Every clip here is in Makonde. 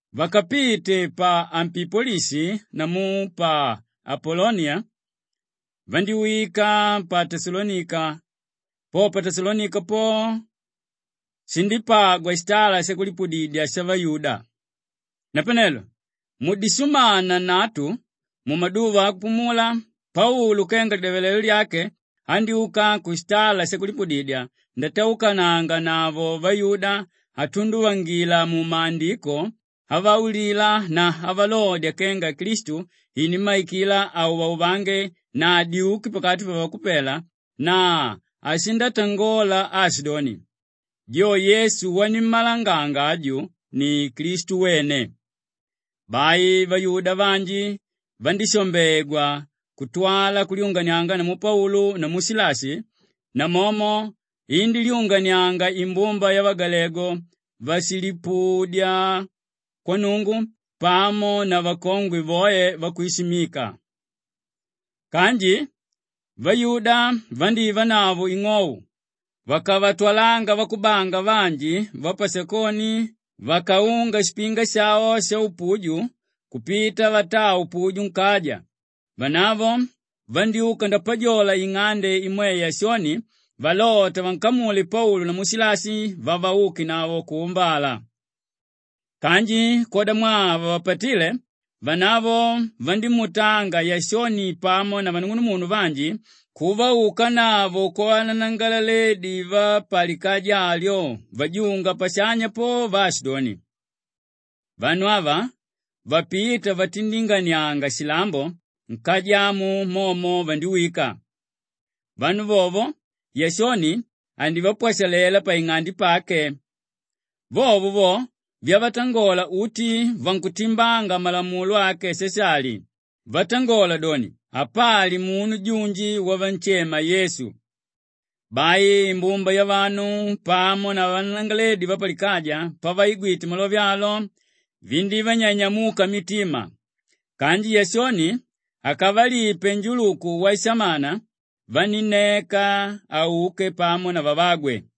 Vakapite pa Ampipolishi namu pa Apoloniya vandíwika pa Teshalonika; po pa Teshalonika po shindípagwa shitala shakulipudidya shavayuda. Napanelo mudishumana nnatu mumaduva akupumula, Paulu kenga lidyavalelo lyake andyúka kushitala shakulipudidya ndataukananganavo vayuda atunduvangila mu Maandiko avaulila na avalodya kenga Klistu inímmaikila auvauvange na adyuke pakati pavakupela na ashindatangola aashidoni, “Jo Yesu wanimmalanganga aju, ni Klistu wene.” Bai vayuda vanji vandishambegwa kutwala kulyunganianga namu Paulu namu Shilashi; namomo indílyunganianga imbumba yavagalegu váshilipudya kwa Nnungu pamo na vakongwe voe vakwishimika. Kanji vayuda vandívanavo ing'ou vakavatwalanga vakubanga vanji vapashakoni vakaunga shipinga shavo shaupuju kupita vataa upuju nkaja; vanavo vandyúka ndapajola ing'ande imwe Yashoni valota vankamule Paulu namu Shilashi vavaukenavo kuumbala. Kanji kwodamwaa havavapatíle, vanavo vandímuutanga Yashoni pamo na vanung'unumunu vanji kuvaukanavo kwavananangalaledi vapalikaja alyo vajunga pashanya po vaashidoni, “Vanu ava vapíta vatindinganianga shilambo, nkaja amu momo vandiwika. Vanu vovo Yashoni andivapwashalela paing'ande pake. Vovo vo vyavatangola uti vakutimbanga malamulo ake Shashali vatangola doni, apali umu junji wavanshema Yesu.” Bai imbumba yavanu pamo na vananangalaledi vapalikaja pavaigwite malove alo, vindívanyanyamuka mitima. Kanji Yashoni akavalipe njuluku washamana vanínneka auke pamo na vavagwe.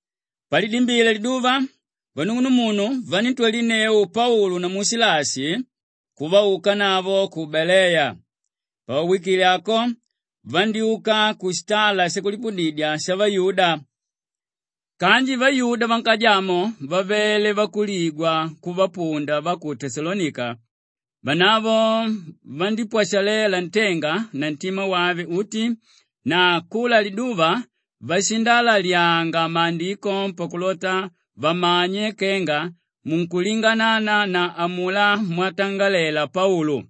Palidimbile liduva vanung'unumunu vaníntwalinneu Paulu namu Shilashi kuvaukanavo ku Beleya. Pavawikile ako vandyúka kushitala shakulipudidya shavayuda. Kanji vayuda vankaja amo vavele vakuligwa kuvapunda va ku Teshalonika; vanavo vandípwashalela ntenga na ntima wave uti na kula liduva vashindalalyanga Maandiko pakulota vamanye kenga munkulinganana na amulá mwatangalela Paulu.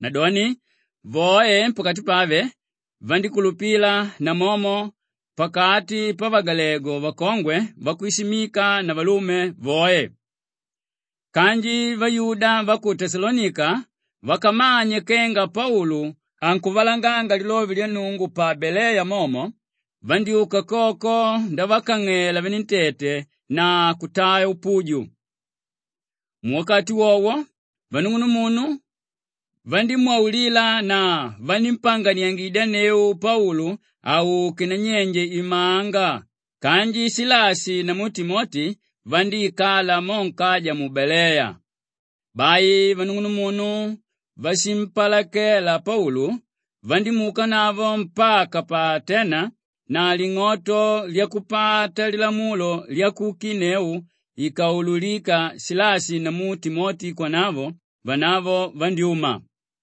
Nadoni voe pakati pave vandíkulupila namomo pakati pavagalegu vakongwe vakwishimika na valume voe. Kanji vayuda va ku Teshalonika vakamanye kenga Paulu ankuvalanganga lilove lya Nnungu pa Beleya momo, vandyúka koko ndavakang'ela venentete na kutaa upuju. Muwakati wowo vanung'unumunnu vandímwaulila na vanímpanganiangidyanneu Paulu auke nanyenje imanga kanji Shilashi namu Timoti vandíikala mo nkaja mu Baleya. Bai vanung'unumunu váshimpalakela Paulu vandímuukanavo mpaka pa Atena na ling'oto lyakupata lilamulo lyakukinneu ikaululika Shilashi namu Timoti kwanavo, vanavo vandyúma.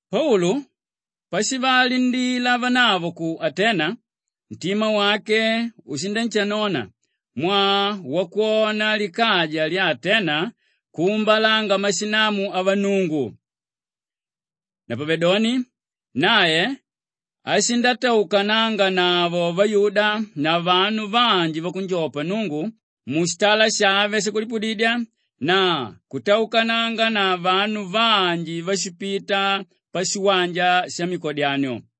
Paulu pashivalindila vanavo ku Atena, ntima wake ushinanshanona mwaa wakwona likaja lya Atena kuumbalanga mashinamu avannungu. Napavedoni nae ashindataukananganavo vayuda na vanu vanji vakunjopa Nnungu mushitala shave shakulipudidya na kutaukananga na vanu vanji váshipita pashiwanja shamikodyanio.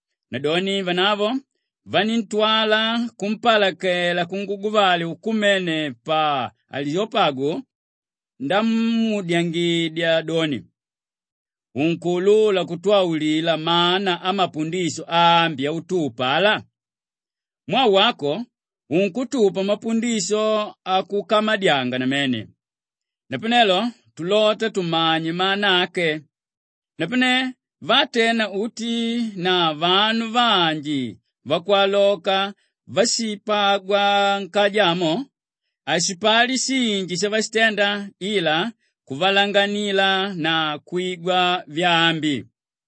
Nadoni vanavo vaníntwala kumpalakela kunguguvale ukumene pa Aliyopagu ndamuudyangidya doni, “Unkuulula kutwaulila mana amapundisho aambi autupa ala? Mwaa wako unkutupa mapundisho akukamadyanga namene. Napanelo tulota tumanye mana ake.” Napane vaatena uti na vanu vanji vakwaloka váshipagwa nkaja amo, hashipali shinji shavashitenda ila kuvalanganila na kwigwa vyaambi.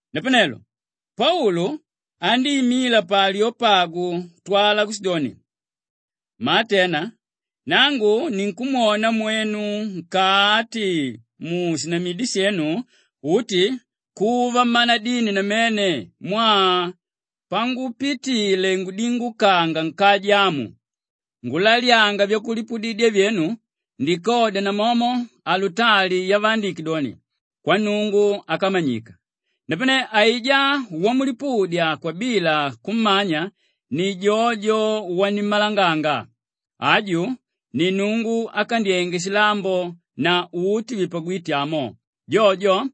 Napanelo Paulu andíimila pa Aliyopagu kutwala kushidoni, “Mmaatena! Nangu ninkumwona mwenu nkati mushinamidi shenu uti kuva mmanadini namene mwaa pangupitile ngudingukanga nkaja amu ngulalyanga vyakulipudidya vyenu ndikodya namomo alutali yavaandike doni, ‘Kwannungu Ákamanyika.’ Napane aijá wamulipudya kwabila kummanya ni jojo wanimmalanganga. Aju ni Nnungu ákandyenge shilambo na uti vipagwíte amo; jojo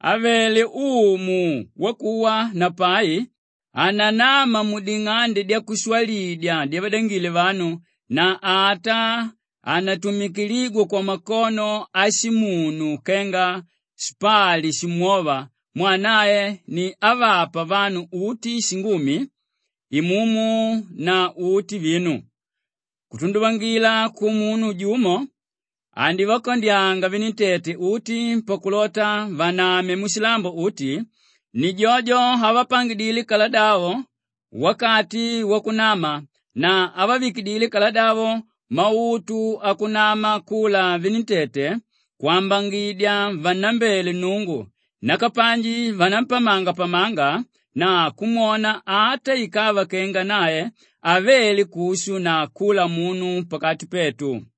ávele Umu wakuwa na pai hananama muding'ande dyakushwalidya dyavadangile vanu na ata hanatumikiligwa kwamakono ashimunu kenga shipali shimwóva mwaa nae ni ávapa vanu uti shingumi, imumu na uti vinu. Kutunduvangila kumunu jumo andivakandyanga venentete uti pakulota vaname mushilambo uti; ni jojo ávapangidile kaladavo wakati wakunama na ávavikidile kaladavo mautu wakunama kula venentete kwambangidya vannambele Nnungu; nakapanji vanampamangapamanga na kumwona ata ikava kenga nae havele kushu na kula munu pakati petu.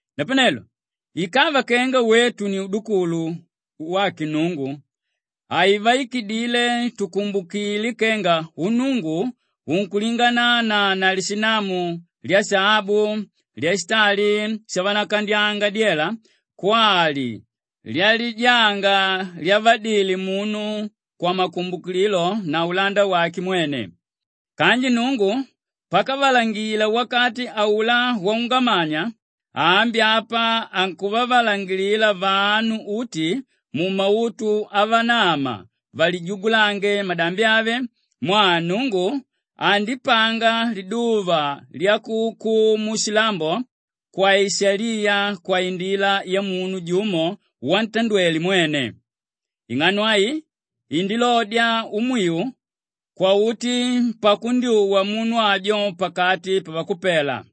“Napanelo ikava kenga wetu ni udukulu wake Nnungu, haivaikidile tukumbukile kenga unnungu unkulinganana na lishinamu lyashaabu, lyashitali shavanakandyanga dyela kwali lyalijanga lyavadile munu kwamakumbukililo na ulanda wake mwene. Kanji Nnungu pakavalangila wakati aulá waungamanya, ambi apa ankuvavalangangila vanu uti mumautu avanama valijugulange madambi ave mwaa Nnungu andipanga liduva lyakuukumu shilambo kwaishaliya kwaindila yamunu jumo wantandwele mwene. Ing'ano ai andilodya umwiu kwauti pakundyuwa munu ajo pakati pavakupela.”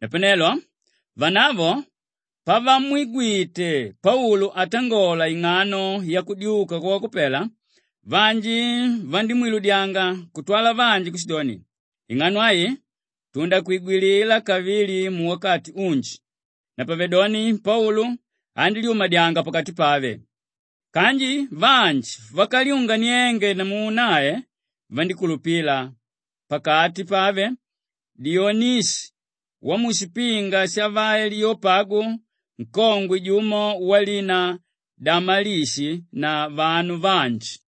Napanelo vanavo pavamwigwite Paulu atangola ing'ano yakudyuka kwavakupela, vanji vandímwiludyanga kutwala vanji kushidoni, “Ing'ano ai tundakwigwilila kavili muwakati unji.” Napavedoni Paulu andílyumadyanga pakati pave. Kanji vanji vakalyunganiange namu nae, vandíkulupila: pakati pave, Dionishiu washipinga shavaliyopagu, nkongwe jumo walina Damalishi na vanu vanji.